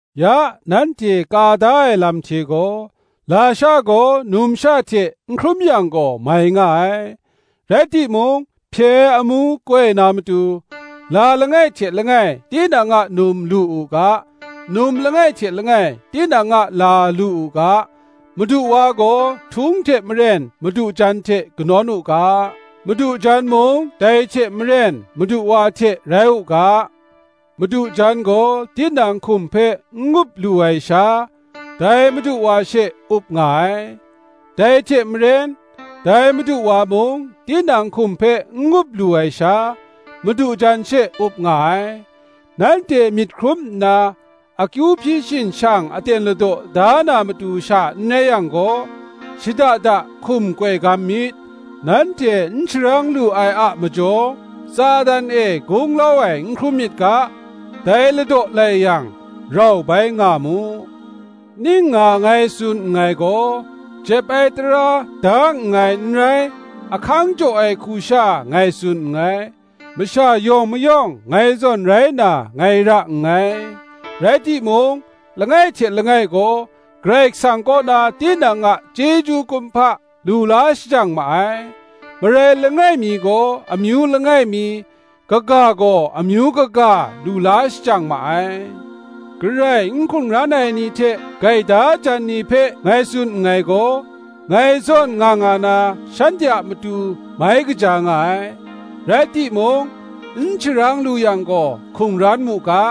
Ya, nanhte ka da ai lam hte gaw, lasha gaw numsha hte n hkrum yang gaw, mai nga ai; rai timung, hpye ai amu koi na matu, la langai hte langai tinang a num lu u ga, num langai hte langai tinang a la lu u ga. Madu wa gaw htung hte maren madu jan hte kanawn u ga, Madu jan mung dai hte maren madu wa hte rai u ga. Madu jan gaw tinang hkum hpe n up lu ai sha, dai madu wa she up nga ai; dai hte maren, dai madu wa mung tinang hkum hpe n up lu ai sha, madu jan she up nga ai. Nanhte myit hkrum nna, akyu hpyi shin shang aten ladaw da na matu sha n rai yang gaw, shada da hkum koi gam myit: nanhte n sharang lu ai a majaw, Satan e gunglau ai n hkrum myit ga, dai ladaw lai yang, rau bai nga mu. Ning nga ngai tsun nngai gaw, jep ai tara da nngai n rai, ahkang jaw ai hku sha ngai tsun nngai. Masha yawng mayawng ngai zawn rai na ngai ra nngai; rai timung, langai hte langai gaw Karai Kasang kaw na tinang a chyeju kumhpa lu la shajang ma ai; marai langai mi gaw amyu langai mi, kaga gaw amyu kaga lu la shajang ma ai. Garai n hkungran ai ni hte gaida jan ni hpe ngai tsun nngai gaw, ngai zawn nga nga na shanhte a matu mai kaja nga ai. Rai timung, n sharang lu yang gaw, hkungran mu ga: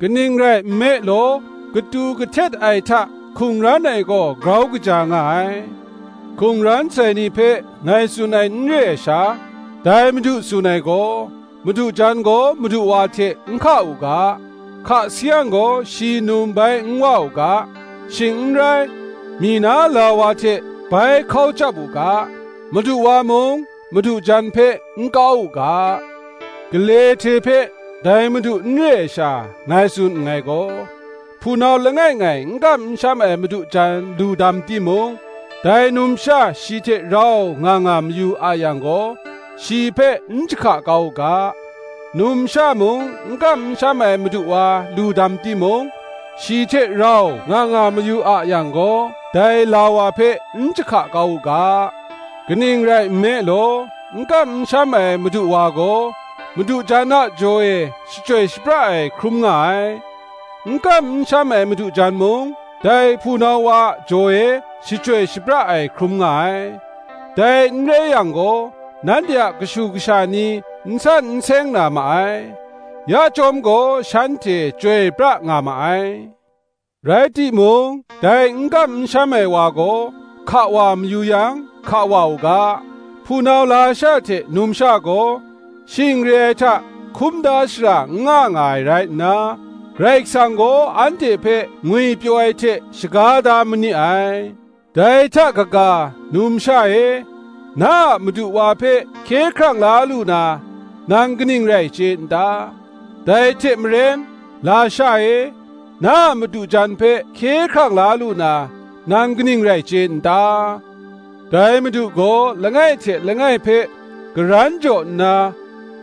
kaning rai nme law, katu kahtet ai hta hkungran ai gaw, grau kaja nga ai. Hkungran sai ni hpe ngai tsun ai n re ai sha, dai Madu tsun ai gaw, madu jan gaw madu wa hte n hka u ga; hka sayang gaw, shi num bai n wa u ga, shing n rai, myi na la wa hte bai hkau chyap u ga; madu wa mung, madu jan hpe n kau u ga. Gale hte hpe, dai Madu n re ai sha, ngai tsun nngai gaw, hpunau langai ngai n kam n sham ai madu jan lu dam timung, dai numsha shi hte rau nga nga mayu a yang gaw, shi hpe n jahka kau u ga. Numsha mung n kam n sham ai madu wa lu dam timung, shi hte rau nga nga mayu a yang gaw, dai la wa hpe n jahka kau u ga. Kaning rai nme law, n kam n sham ai madu wa gaw, madu jan a jaw e shachyoi shapra ai hkrum nga ai; n kam n sham ai madu jan mung, dai hpunau wa a jaw e shachyoi shapra ai hkrum nga ai: dai n rai yang gaw, nanhte a kashu kasha ni n san n seng na ma ai; ya chyawm gaw shanhte chyoi pra nga ma ai. Rai timung, dai n kam n sham ai wa gaw hka wa mayu yang, hka wa u ga: hpunau lasha hte numsha gaw shing re ai hta hkum da shara n nga nga ai rai nna, Karai Kasang gaw anhte hpe ngwipyaw ai hte shaga da ma ni ai. Dai hta kaga, numsha e, na a madu wa hpe hkye hkrang la lu na, nang kaning rai chye n ta? dai hte maren, lasha e, na a madu jan hpe hkye hkrang la lu na, nang kaning rai chye n ta? Dai Madu gaw langai hte langai hpe karan jaw nna,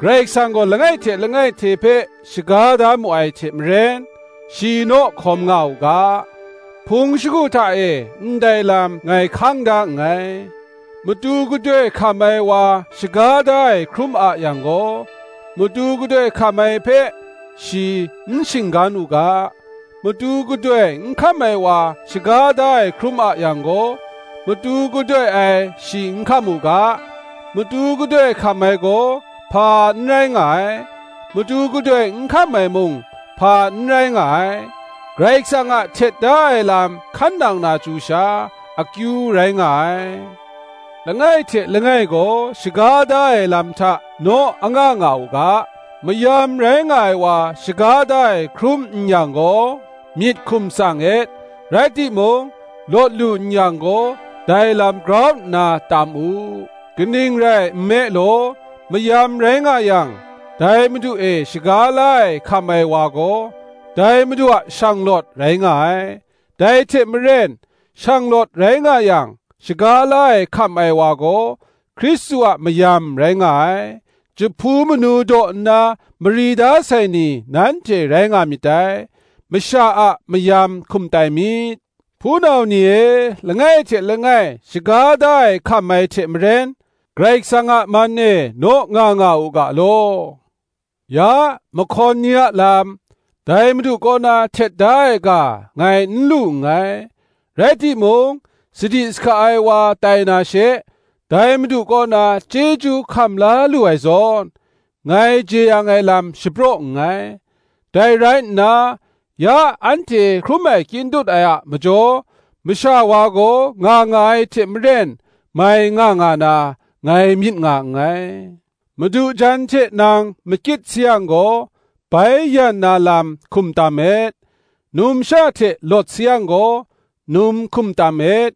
Karai Kasang gaw langai hte langai hte hpe shaga da mu ai hte maren, shi naw hkawm nga u ga. Hpung shagu hta e ndai lam ngai hkang da nngai. Matu gadoi hkam ai wa shaga da ai hkrum a yang gaw, matu gadoi hkam ai hpe shi n shinggan u ga. Matu gadoi n hkam ai wa shaga da ai hkrum a yang gaw, matu gadoi ai shi n hkam u ga. Matu gadoi hkam ai gaw, hpa n rai nga ai; matu gadoi n hkam ai mung, hpa n rai nga ai: Karai Kasang a htet da ai lam hkan nang na chyu sha, akyu rai nga ai. Langai hte langai gaw shaga da ai lam hta naw anga nga u ga. Mayam rai nga ai wa shaga da ai hkrum n yang gaw, myit hkum tsang et; rai timung, lawt lu n yang gaw, dai lam grau nna tam u. Kaning rai nme law, mayam rai nga yang, dai Madu e shaga la ai hkam ai wa gaw, dai Madu a shanglawt rai nga ai; dai hte maren shanglawt rai nga yang, shaga la ai hkam ai wa gaw, Hkristu a mayam rai nga ai. Jahpu manu daw nna mari da sai ni nanhte rai nga myit dai: masha a mayam hkum tai myit. Hpunau ni e, langai hte langai shaga da ai hkam ai hte maren, Karai Kasang a man e naw nga nga u ga law. Ya, mahkawn ni a lam, dai Madu kaw na htet da ai ga ngai n lu nngai: rai timung, sadi sahka ai wa tai na she, dai Madu kaw na chyeju hkam la lu ai zawn, ngai jeyang ai lam shapraw nngai. Dai rai nna, ya anhte hkrum ai kyin dut ai a majaw, masha wa gaw nga nga ai hte maren mai nga nga na, ngai myit nga nngai. Madu jan hte nang makyit sayang gaw, bai yan na lam hkum tam et; numsha hte lawt sayang gaw, num hkum tam et.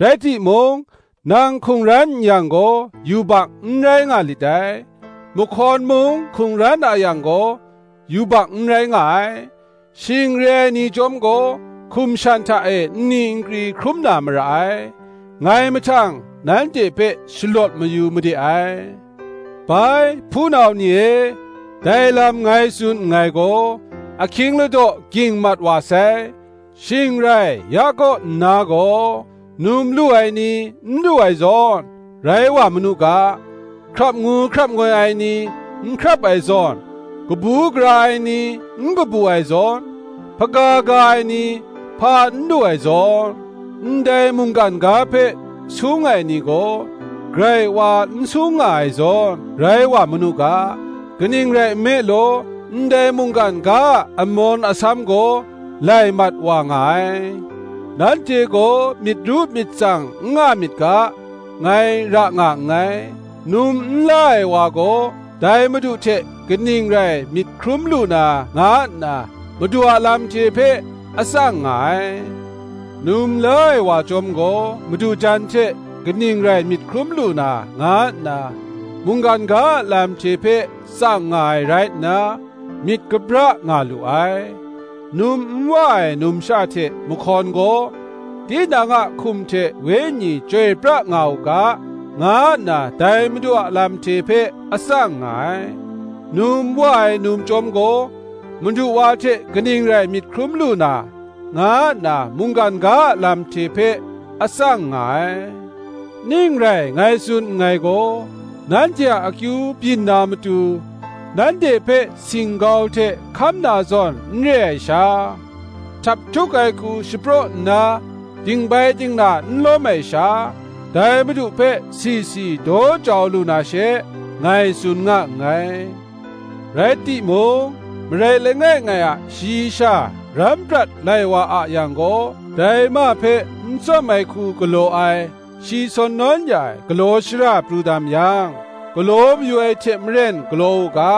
Rai timung, nang hkungran n yang gaw, yubak n rai nga lit dai; mahkawn mung hkungran a yang gaw, yubak n rai nga ai; shing re ai ni chyawm gaw, hkum shan hta e nni nkri hkrum na mara ai: ngai mahtang, nanhte hpe shalawt mayu made ai. Bai, hpunau ni e, dai lam ngai tsun nngai gaw, ahkying ladaw gying mat wa sai; shing rai ya kaw nna gaw, num lu ai ni, n lu ai zawn, rai wa manu ga; hkrap ngu hkrap ngoi ai ni, n hkrap ai zawn; kabu gara ai ni, n kabu ai zawn; hpaga ga ai ni, hpa n lu ai zawn; ndai mungkan ga hpe sung ai ni gaw, grai wa n sung nga ai zawn, rai wa manu ga; kaning rai nme law, ndai mungkan ga a amawn asam gaw lai mat wa nga ai. Nanhte gaw myit ru myit tsang n nga myit ga, ngai ra nga nngai. Num n la ai wa gaw, dai Madu hte kaning rai myit hkrum lu na nga nna, Madu a lam hte hpe a tsang nga ai: num la ai wa chyawm gaw, madu jan hte kaning rai myit hkrum lu na, nga nna, mungkan ga a lam hte hpe tsang nga ai rai nna, myit kabra nga lu ai. Num n wa ai numsha hte mahkawn gaw, tinang a hkum hte wenyi chyoi pra nga u ga, nga nna dai Madu a lam hte hpe a tsang nga ai: num wa ai num chyawm gaw, madu wa hte kaning rai myit hkrum lu na, nga nna mungkan ga a lam hte hpe a tsang nga ai. Ning rai ngai tsun nngai gaw, nanhte a akyu byin na matu, nanhte hpe singgau hte hkam na zawn n re ai sha, htaphtuk ai hku shapraw nna, dingbai dingna n lawm ai sha, dai Madu hpe si si daw jau lu na she, ngai tsun nga nngai. Rai timung, marai langai ngai a shayi sha ram prat lai wa a yang gaw, dai ma hpe n tsawm ai hku galaw ai, shi sawn nawn ya ai; galaw shara pru dam yang, galaw mayu ai hte maren galaw u ga;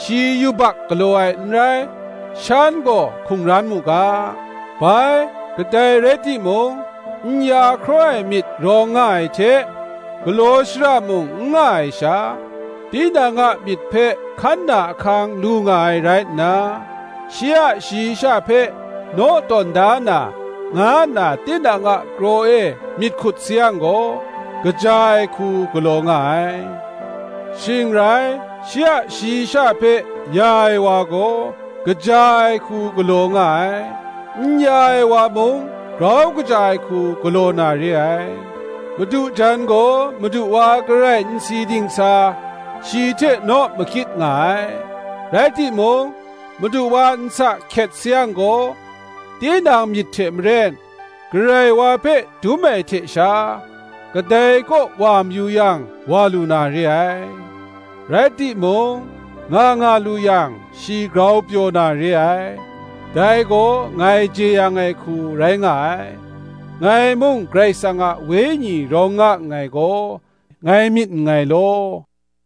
shi yubak galaw ai n rai: shan gaw hkungran mu ga. Bai, kadai rai timung n ya hkraw ai myit rawng nga ai hte, galaw shara mung n nga ai sha, tinang a myit hpe hkan na ahkang lu nga ai rai nna, shi a shayi sha hpe naw tawn da na, nga nna tinang a kraw e myit hkut sayang gaw, kaja ai hku galaw nga ai. Shing rai, shi a shayi sha hpe ya ai wa gaw, kaja ai hku galaw nga ai; n ya ai wa mung grau kaja ai hku galaw na re ai. Madu jan gaw, madu wa garai n si dingsa, shi hte naw makyit nga ai: rai timung, madu wa nsa hkyet sayang gaw, tinang myit hte maren, Karai Wa hpe dum ai hte sha, kadai kaw wa mayu yang, wa lu na re ai. Rai timung, nga nga lu yang shi grau pyaw na re ai; dai gaw ngai jeyang ai hku rai nga ai; ngai mung Karai Kasang a Wenyi rawng nga nngai gaw, ngai myit nngai law.